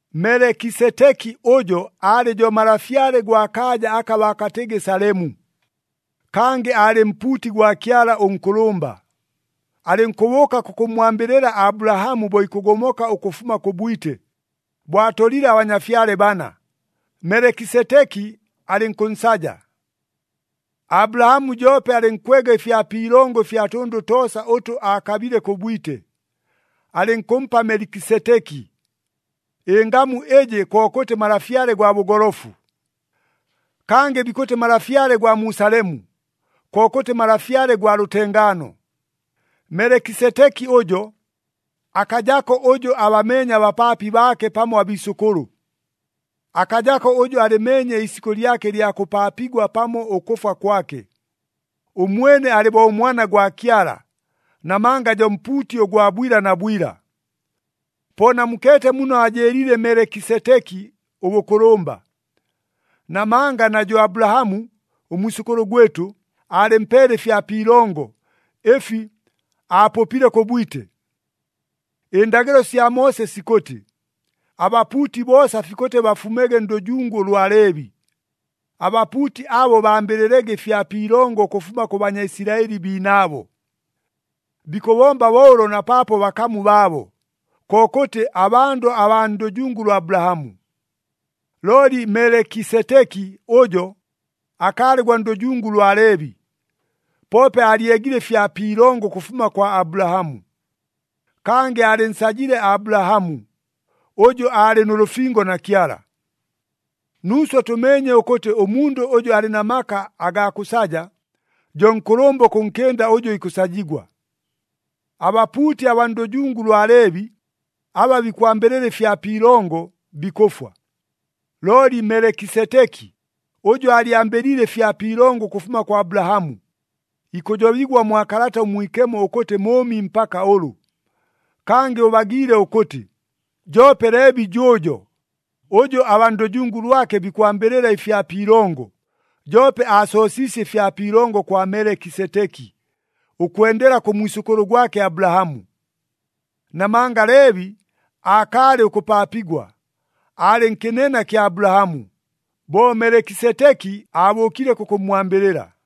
Melekiseteki ʉjo aalɨ jo malafyale gwa kaaja aka baakatɨgɨ Salemu, kangɨ aalɨ mpuuti gwa Kyala ʉNkʉlʉmba. Alɨnkʉbʉʉka kʉkʉmmwambɨlɨla Abulahamu bo ikʉgomoka ʉkʉfuma kʉ bwite, bo abatolile abanyafyale bana, Melekiseteki alɨnkʉnsaja. Abulahamu joope alɨnkwega ɨfya pi ilongo ɨfya tʉndʉ toosa ʉtʉ aakabile kʉ bwite, alɨnkʉmpa Melekiseteki. Ɨngamu ɨjɨ kokʉtɨ malafyale gwa bʉgolofu. Kangɨ bikʉtɨ malafyale gwa mu Salemu, kokʉtɨ malafyale gwa lʉtengaano. Melekiseteki ʉjo, akajako ʉjʉ abameenye abapaapi baake pamo abiisʉkʉlʉ. Akajako ʉjʉ alɨmeenye iisikʉ lyake ɨlya kʉpaapigwa pamo ʉkʉfwa kwake. Ʉmwene alɨ bo ʉMwana gwa Kyala, namanga jo mpuuti ʉgwa bwila na bwila. Po namukeete muno aajɨɨliile Melekiseteki ʉbʉkʉlʉmba. Namanga na jʉ Abulahamu, ʉmwisʉkʉlʉ gwɨtʉ, aalɨmpeele ɨfya pi ilongo, ɨfi aapʉpile kʉ bwite. Ɨndagɨlo sya Moose sikʉtɨ, abapuuti boosa fikʉtɨ bafumege ndʉjungu ʉlwa Leebi. Abapuuti abo bambɨlɨlege ɨfya pi ilongo ʉkʉfuma kʉ Banyaisilaɨli biinaabo. Bikʉbomba bo ʉlo na paapo bakamu baabo, kokʉtɨ abandʉ abaa ndʉjungu lwa Abulahamu. Looli Melekiseteki ʉjo, akaalɨ gwa ndʉjungu lwa Leebi, poope aalyegile ɨfya pi ilongo ʉkʉfuma kwa Abulahamu. Kangɨ aalɨnsajile Abulahamu, ʉjʉ aalɨ nʉ lʉfingo na Kyala. Nuuswe tʉmeenye ʉkʉtɨ ʉmundʉ ʉjʉ alɨ na maka agaa kʉsaja, jo nkʉlʉmba ʉkʉnkɨnda ʉjʉ ikʉsajigwa. Abapuuti abaa ndʉjungu lwa Leebi, aba bikwambɨlɨla ɨfya pi ilongo, bikʉfwa. Looli Melekiseteki, ʉjʉ aalyambɨliile ɨfya pi ilongo ʉkʉfuma kwa Abulahamu, ikʉjobigwa mwa Kalata ʉMwikemo ʉkʉtɨ mʉʉmi mpaka ʉlʉ. Kangɨ ʉbagiile ʉkʉtɨ, joope Leebi jʉʉjo, ʉjʉ abaa ndʉjungu lwake bikwambɨlɨla ɨfya pi ilongo, joope aasoosiisye ɨfya pi ilongo kwa Melekiseteki, ʉkwendela kʉ mwisʉkʉlʉ gwake Abulahamu. Namanga Leebi aakaalɨ ʉkʉpaapigwa, aalɨ nkɨnena kya Abulahamu, bo Melekiseteki abʉʉkile kʉkʉmmwambɨlɨla.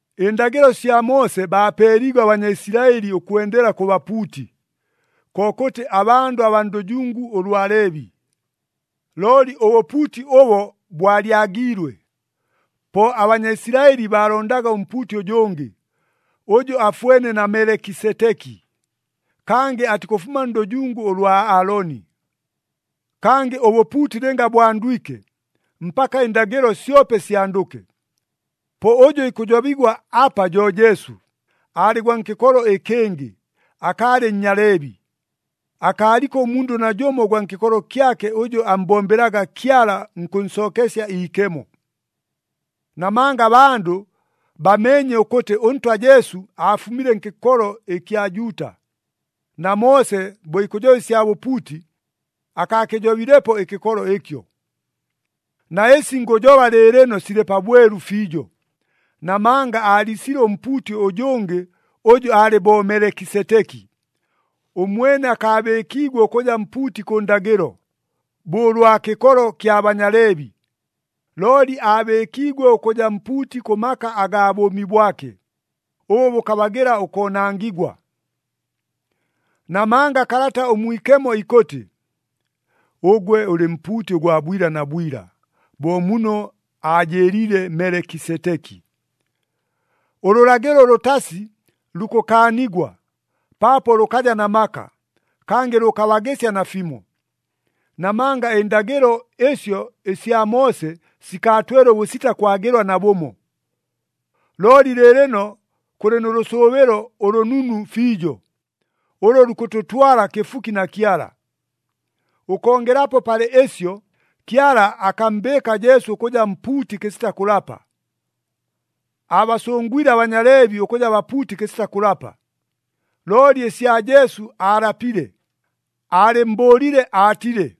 Ɨndagɨlo sya Moose baapeeliigwe aBanyaisilaɨli ʉkwendela kʉ bapuuti, kokʉtɨ abandʉ abaa ndʉjungu ʉlwa Leebi. Looli ʉbʉpuuti ʉbo bwalyagiilwe. Po aBanyaisilaɨli baalondaga ʉmpuuti ʉjʉngɨ, ʉjʉ afwene na Melekiseteki, kangɨ atikʉfuma ndʉjungu ʉlwa Aaloni. Kangɨ ʉbʉpuuti lɨnga bwandwike, mpaka ɨndagɨlo syope syandʉke. Po ʉjʉ ikʉjobigwa apa jo Jesu, aalɨ gwa nkɨkolo ɨkɨngɨ, akaalɨ Nnyaleebi. Akaaliko ʉmundʉ najʉmo ʉgwa nkɨkolo kyake ʉjʉ ammbombelaga Kyala nkʉnsookesya iikemo. Namanga abandʉ bameenye ʉkʉtɨ ʉNtwa Jesu aafumile nkɨkolo ɨkya Juuta, na Moose bo ikʉjoba ɨsya bapuuti, akaakɨjobilepo ɨkɨkolo ɨkyo. Na ɨsi ngʉjoba lɨɨlɨno silɨ pabwelu fiijo, namanga aaliisile ʉmpuuti ʉjʉngɨ ʉjʉ alɨ bo Melekiseteki. Ʉmwene akaabɨɨkiigwe ʉkʉja mpuuti kʉ ndagɨlo, bo ʉlwa kɨkolo kya Banyaleebi, looli aabɨɨkiigwe ʉkʉja mpuuti kʉ maka agaa bʉʉmi bwake, ʉbʉ bʉkabagɨla ʉkoonangigwa. Namanga Kalata ʉMwikemo ikʉtɨ, “Ʉgwe ʉlɨ mpuuti ʉgwa bwila na bwila, bo muno aajɨɨliile Melekiseteki.” Ʉlʉlagɨlo ʉlʉtasi lukʉkaanigwa, paapo lʉkaja na maka, kangɨ lʉkabagɨsya nafimo. Namanga ɨndagɨlo ɨsyo ɨsya Moose sikaatwele ʉbʉsita kwagɨlwa nabʉmo. Looli lɨɨlɨno kʉlɨ nʉ lʉsʉʉbɨlo ʉlʉnunu fiijo, ʉlʉ lukʉtʉtwala kɨfuki na Kyala. Ʉkongelapo palɨ ɨsyo, Kyala akammbɨɨka Jesu ʉkʉja mpuuti kɨsita kʉlapa. Aabasʉngwile aBanyaleebi ʉkʉja bapuuti kɨsita kʉlapa, looli ɨsya Jesu aalapile, aalɨmmbʉʉlile aatile,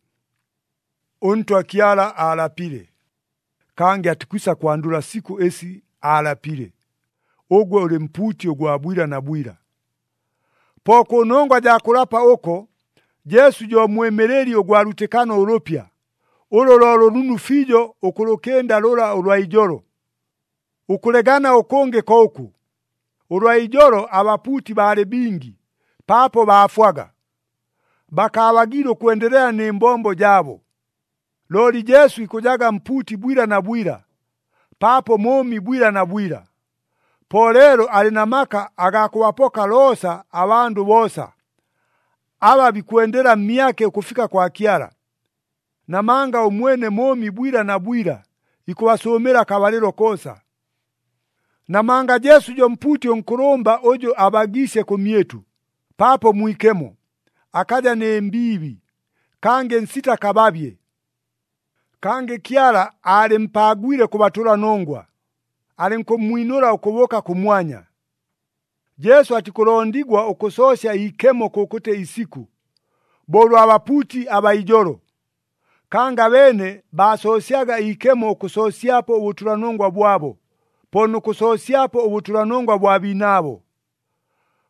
“ɄNtwa Kyala aalapile, kangɨ atikwisa kwandʉla sikʉ ɨsi aalapile, ‘Ʉgwe ʉlɨ mpuuti ʉgwa bwila na bwila.’” Po kʉnongwa jaa kʉlapa ʉko, Jesu jo mwɨmɨlɨli ʉgwa lwitɨkano ʉlʉpya, ʉlʉ lo lʉnunu fiijo ʉkʉlʉkɨnda lʉla ʉlwa ijolo. Ʉkʉlegana ʉkʉngɨ ko ʉkʉ, ʉlwa ijolo abapuuti baalɨ bingi, paapo baafwaga. Bakaabagiile ʉkwendelela nɨ mbombo jaabo. Looli Jesu ikʉjaga mpuuti bwila na bwila, paapo mʉʉmi bwila na bwila. Po leelo alɨ na maka agaa kʉbapoka loosa abandʉ boosa, aba bikwendela mmyake ʉkʉfika kwa Kyala. Namanga ʉmwene mʉʉmi bwila na bwila ikʉbasʉʉmɨla akabalɨlo koosa. Namanga Jesu jo mpuuti ʉnkʉlʉmba ʉjʉ abagiisye kʉmyɨtʉ, paapo mwikemo, akaja nɨ mbiibi, kangɨ nsita kababye. Kangɨ Kyala aalɨmpaagwile kʉ batʉlanongwa, alɨnkʉmmwinʉla ʉkʉbʉʉka kʉmwanya. Jesu atikʉlondigwa ʉkʉsoosya iikemo kʉkʉtɨ isikʉ, bo ʉlwa bapuuti abaa ijolo. Kangɨ abeene baasoosyaga iikemo ʉkʉsoosyapo ʉbʉtʉlanongwa bwabo, po nʉ kʉsoosyapo ʉbʉtʉlanongwa bwa biinaabo.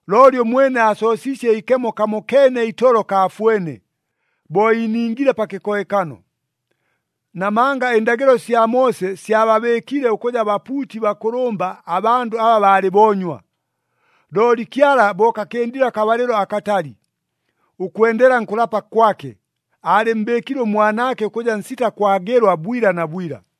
Looli ʉmwene aasoosiisye iikemo kamokeene itolo kaafwene, bo iiningile pa kɨkohekano. Namanga ɨndagɨlo sya Moose syababɨɨkile ʉkʉja bapuuti bakʉlʉmba abandʉ aba baalɨ boonywa. Looli Kyala bo kakɨndile akabalɨlo akatali, ʉkwendela nkʉlapa kwake, aalɨmmbɨɨkile ʉMwanaake ʉkʉja nsita kwagɨlwa bwila na bwila.